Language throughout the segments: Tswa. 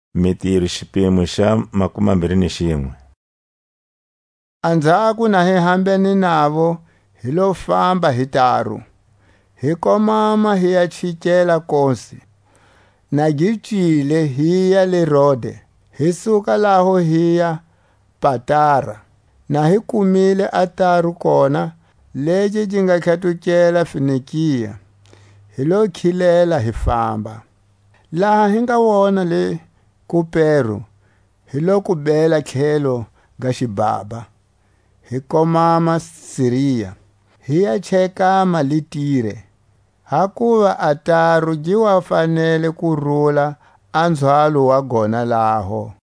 A pfhumba goya Jerusalema. Anzhako na hi hambene navo hi lo famba hi taru, hi komama hiya chikela Kose, na gi cile hiya le Rode, hi suka laho hiya Patara. Na hi kumile a taru kona, legi gi nga tlhatukela Fenikia, hi lo khilela hi famba. Laha hi nga wona le Kupero hi lo ku bela tlhelo ga xibhabha, hi komama Siria, hi ya chekama le Tire; hakuva a taru gi wa fanele ku rula a nzhwalo wa gona laho.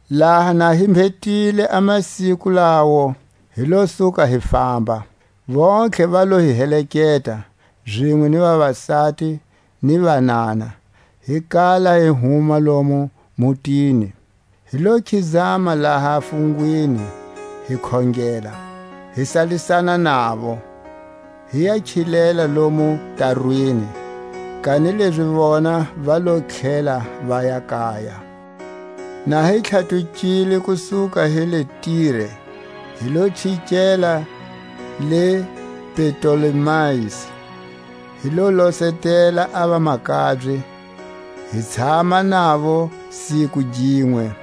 Laha na hi mbhetile a masiku lawo, hi lo suka hi famba; vontlhe va lo hi heleketa, zinwe ni vavasati ni vanana, hi kala hi huma lomu mutini; hi lo khizama laha fungwini, hi khongela, hi salisana navo, hi ya khilela lomu tarwini, kanilezi vona va lo tlhela vaya kaya. Na hi tlhatukile ku suka hi le Tire hi lo chikela le Ptolemais; hi lo losetela a vamakabye, hi tshama navo siku ginwe.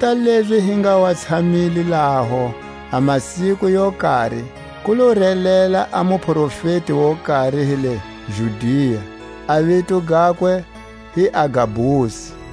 Kota lezi hi nga wa tshamile laho a masiku yo kari, ku lo relela a muprofeti wo kari hi le Judia, a vito gakwe hi Agabusi.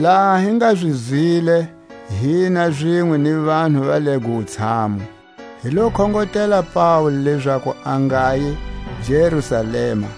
Laha hi nga zi zwile, hina zinwe ni vanhu va lego wutshamu, hi lo khongotela Paule lezaku a ngayi Jerusalema.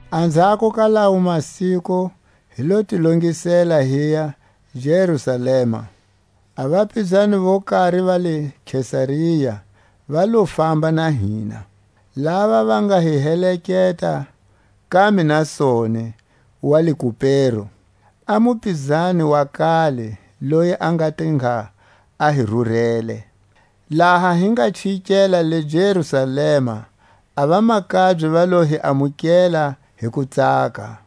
Anzhako ka lawo masiku hi lo ti longisela, hiya Jerusalema, A vapizani vo kari va le Kesaria va lo famba na hina, lava va nga hi heleketa ka Mnasoni wa le Kupero, a mupizani wa kale, loyi a nga te ngha a hi rurele. Laha hi nga chikela le Jerusalema a vamakabye va lo hi amukela hi kutsaka.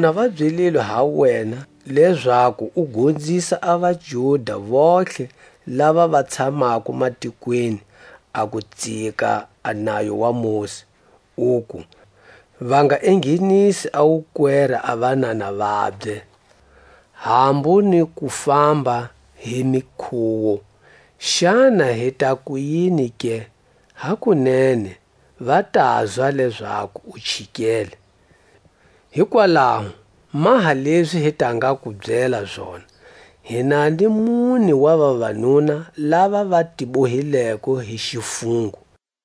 Vona va byelilwe ha wena, lezaku u gonzisa a vaJuda vontlhe lava va tshamako matikweni, a ku tsika a nayo wa Mosi, uku: Va nga enghenisi wukwera a vanana vabye, hambu ni ku famba hi mikhuwo. Xana hi ta kuyini ke? Hakunene va tazwa lezaku u chikele. Hikwalaho maha lezi hi ta nga ku byela zona. Hi na ni mune wa vavanuna lava va ti bohileko hi xifungo;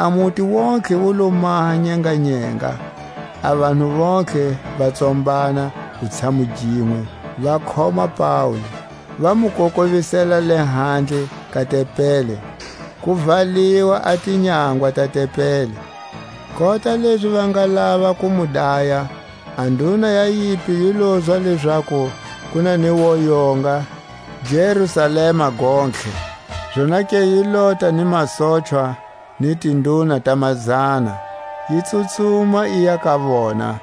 A muti wontihe wu lo maha nyenganyenga, a vanhu vontlhe va tsombana wutshamu ginwe; va khoma Paule, va mu kokovisela lehandle ka tempeli, ku valiwa a tinyangwa ta tempeli. Kota lezi va nga lava ku mu daya, a nduna ya yimpi yi lozwa lezaku ku na ni woyonga Jerusalema gontlhe. Zonake yi lota ni masochwa ni tinduna ta mazana, yi tsutsuma yiya ka vona.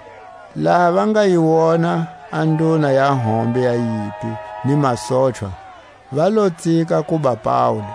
Laha va nga yi wona a nduna ya hombe ya yimpi ni masochwa, va lo tsika kuba Paule.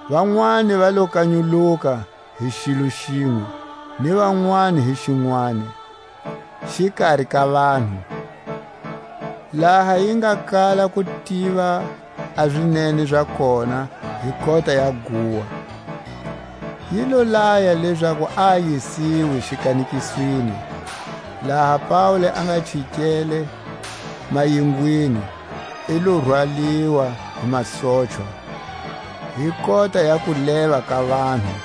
Vanwani va lo kanyuluka hi xilo xinwe, ni vanwani hi xinwani, xikari ka vanhu. Laha yi nga kala ku tiva a zinene za kona hi kota ya guwa, yi lo laya lezaku a yisiwe xikanekisweni. Laha Paule a nga chikele mayingweni, i lo rwaliwa hi masochwa hi kota ya kuleva ka vanhu,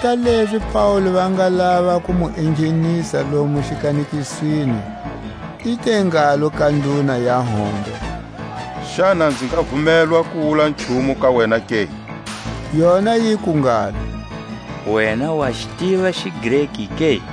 Kota lezi Paule va nga lava ku mu enghenisa lomo xikanekisweni, i te ngalo ka nduna ya hombe: Xana nzi nga vumelwa ku wula nchumu ka wena ke? Yona yiku ngalo: Wena wa xi tiva xiGreki ke?